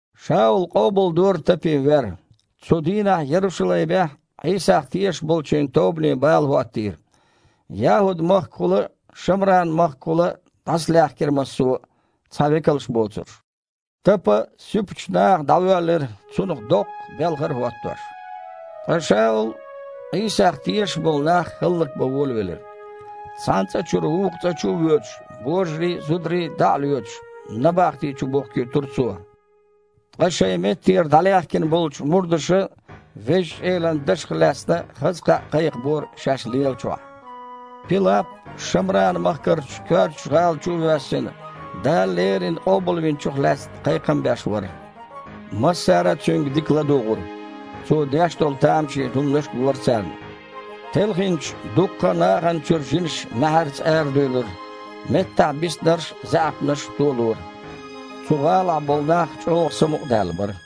Шаула къобалдора Тапин вер. Цу дийнахь Ярушалаймехь Іийсах тешаш болчийн тобане бала хІоттийра. ЯхІуд-махкахула а, Шамран-махкахула а дІасалаьхкира массо а, цхьа векалш боцурш. Тапа суьпачу наха дІавоьллира, цунах доккха белхар а хІоттош. Ткъа Шаул Іийсах тешаш болу нах хІаллакбан волавелира. Цхьана цІа чуьра вукху чу а воьдуш, божарий а, зударий а дІа а лоьцуш, набахти чу бухкуьйтура цо. Ткъа шайн меттера дІалаьхкина болчу мурдаша Везачу Элан Дашах лаьцна хаза кхаъ кхайкхабора шаьш лелачохь. Пилап, Шамран-махкарчу коьртачу гІала чу а воьссина, Дала леррина Къобалвинчух лаьцна кхайкхам беш вара. Массара а цуьнга дика ладугІура. Цо деш долу тамашийна хІуманаш а гора царна. Телхинчу дуккха а нахана чуьра жинаш маьхьарца арадуьйлура, меттахь биснарш а, заьІапнаш а толора. Цу гІалахь болу нах чІогІа самукъадаьлла бара.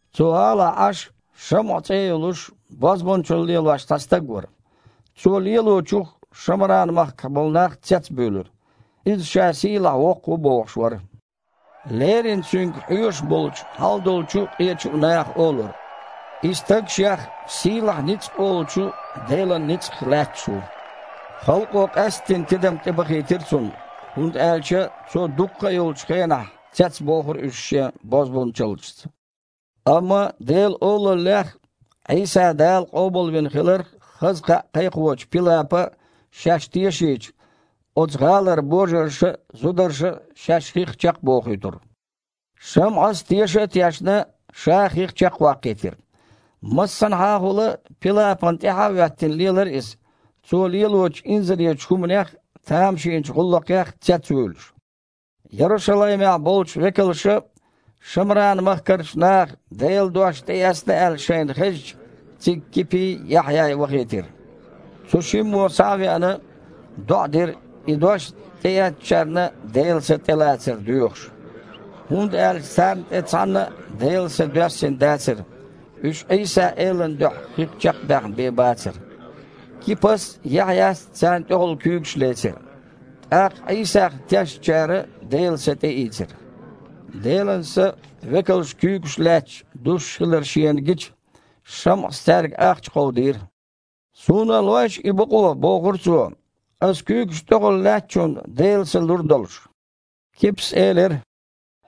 Цу гІалахь Іаш, ШамІа цІе а йолуш, бозбунчалла лелош, цхьа стаг вара. Цо лелочух Шамран-махкахь болу нах цецбуьйлура. Иза ша сийлахь-воккха ву бохуш вара. Леррина цуьнга хьоьжуш болчу хьалдолчу а, къечу а наха олура: «И стаг шех „Сийлахь ницкъ“ олучу Делан ницкъах лаьтташ ву». Халкъо къаьсттина тидам тІебахийтира цунна, хІунда аьлча цо дуккха а йолчу хенахь цецбохура уьш шен бозбунчаллашца. Амма Делан олаллех а, Іийса Дала къобалвина хиларх а хаза кхаъ кхайкхочу Пилапа шаьш тешийча, оцу гІалара божарша а, зударша а шаьш хих чекхбохуьйтура. ШамІас, теша а тешна, ша а хих чекхваккхийтира. Массанхьахула а Пилапана тІаьхьа а хІоьттина лелара иза, цо лелочу инзаречу хІуманех а, тамашийна гІуллакхех а цецвуьйлуш. Ярушалаймехь болчу векалша, Шамран-махкарчу наха Делан дош тІеэцна аьлла шайна хезча, цига Кипий, Яхьъяй вахийтира. Цу шиммо, схьа а веана, доІа дира, и дош тІеэцначарна Делан Са тІелацар доьхуш. ХІунда аьлча царна тІе цхьанна а Делан Са доьссина дацара. Уьш Іийса-Элан дуьхьа хих чекхбаьхна бен бацара. Кипас а, Яхьъяс а царна тІехула куьйгаш лецира, тІаккха Іийсах тешначарна Делан Са тІеийцира. Делан Са, векалша куьйгаш лаьцча, дуссуш хилар шена гича, ШамІас цаьрга ахча кховдийра: «Суна а лойша и бакъо, – бохура цо, – Ас куьйгаш тІехула лаьцначунна Делан Са лур долуш». Кипас элира: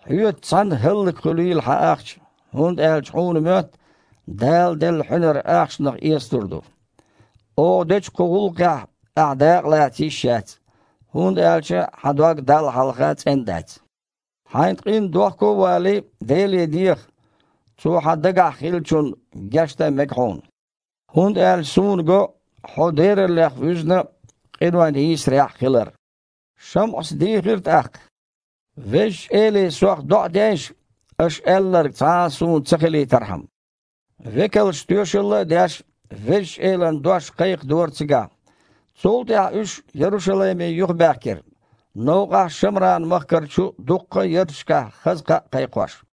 «Хьоьца цхьаьна хІаллакьхуьлийла хьан ахча, хІунда аьлча хьуна моьтту, Дала делла хьуьнар ахчанах эцалур ду. Оха дечу кху гІуллакхехь ахьа дакъалаца йиш яц, хІунда аьлча хьан дог Далла хьалха цІена дац. Хьайн къинна дохко а валий, Деле деха, Цо хьан дагахь хиллачунна гечдан а мега хьуна. ХІунда аьлча суна го, хьо дераллех вуьзна а, къинойн йийсарехь а хилар». ШамІас дийхира тІаккха: «Везачу Эле сох доІа дейша, аша аьлларг цхьа а суна ца хилийтархьама». Векалша, тоьшалла а деш, Везачу Элан дош кхайкхадора цигахь. Цул тІаьхьа уьш Ярушалайме юхабаьхкира, новкъахь Шамран-махкарчу дуккха а ярташкахь хаза кхаъ а кхайкхош.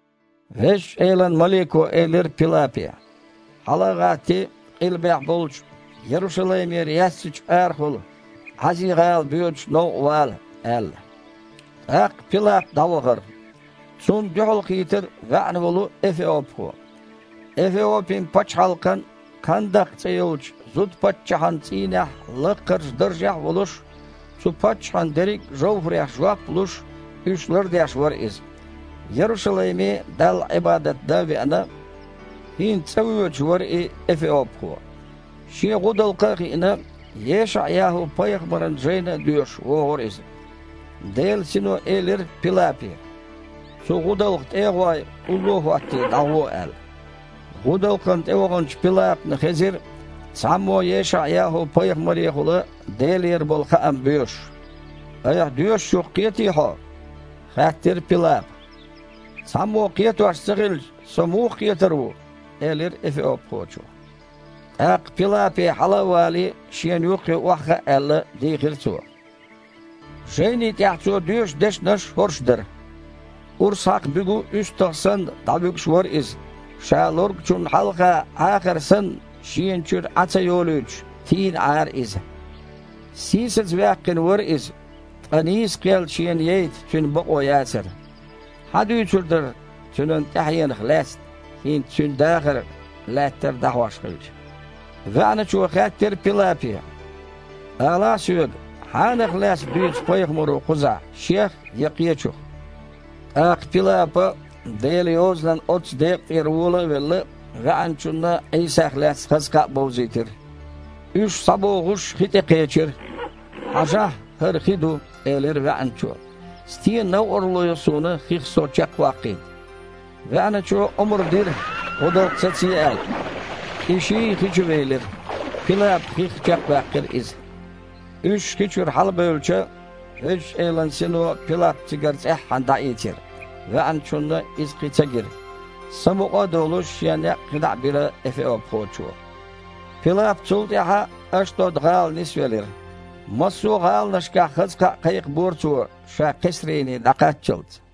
Везачу Элан малико элира Пилапе: «Хьала а гІаттий, къилбехь болчу, Ярушалаймера яьссачу арахула Іази-гІала боьдучу новкъа вала», – аьлла. ТІаккха Пилап дІавахара. Цунна дуьхьалкхийтира ваьІна волу эфиопхо. Эфиопин-пачхьалкхан Кхандакх цІе йолчу зуда-паччахьан цІийнехь лаккхарчу даржехь а волуш, цу паччахьан дерриг а жовхІарех жоп а луш, уьш лардеш вара иза. Ярушалайме Далла Іибадат дан а веана, хІинца цІа воьдуш вара и эфиопхо. Шен гІудалкха а хиъна, ЕшаІ-ЯхІу-пайхамаран жайна а доьшуш, вогІура иза. Делан Сино элира Пилапе: «Цу гІудалкха тІе а гІой, улло а хІоттий, дІагІо», – аьлла. ГІудалкхана тІеваханчу Пилапна хезира цхьаммо ЕшаІ-ЯхІу-пайхамарехула Делера болу хаам боьшуш. «Айхьа доьшучух кхетий хьо?» – хаьттира Пилапа. «Цхьаммо кхетош ца хилча, со муха кхетар ву?» – элира эфиопхочо. ТІаккха Пилапе, хьала а валий, шена юххе охьахаа аьлла, дийхира цо. Жайни тІехь цо доьшу дешнаш хІорш дара: «Урс хьакха буьгу уьстагІ санна, дІавуьгуш вара Иза, ша лоргучунна хьалха, Іахар санна, шена чуьра Іаь ца йолуьйтуш, тийна Іара Иза. Сийсазваьккхина вара Иза, ткъа нийса кхел Шена яйта Цуьнан бакъо яцара. Хьан дуьйцур дара Цуьнан тІаьхьенах лаьцна, хІинца Цуьнан дахар лаьттара дІахьош хилча?» ВаьІначо хаьттира Пилапе: «Алахьа соьга, хьанах лаьцна дуьйцу пайхамаро кхузахь, шех я кхечух?» ТІаккха Пилапа Делан Йозанан оццу декъа тІера вола а велла, ваьІначунна Іийсах лаьцна хаза кхаъ бовзийтира. Уьш схьабогІуш хи тІе кхечира. «Хьажахьа, хІара хи ду, – элира ваьІначо, – стен новкъарло йо суна хих со чекхваккхийта?» ВаьІначо омра дира, гІудалкх сацае аьлла. И ший а хи чу велира. Пилапа хих чекхваьккхира иза. Уьш хи чуьра хьалабевлча, Везачу Элан Сино Пилап цигара цІеххьана дІаийцира, ваьІначунна иза кхин ца гира. Самукъа а долуш, шен некъ кхин дІа а бира эфиопхочо. Пилап цул тІаьхьа Ашдод-гІала нисвелира. Массо а гІаланашкахь хаза кхаъ кхайкхабора цо, ша Кхесрине дІакхаччалц.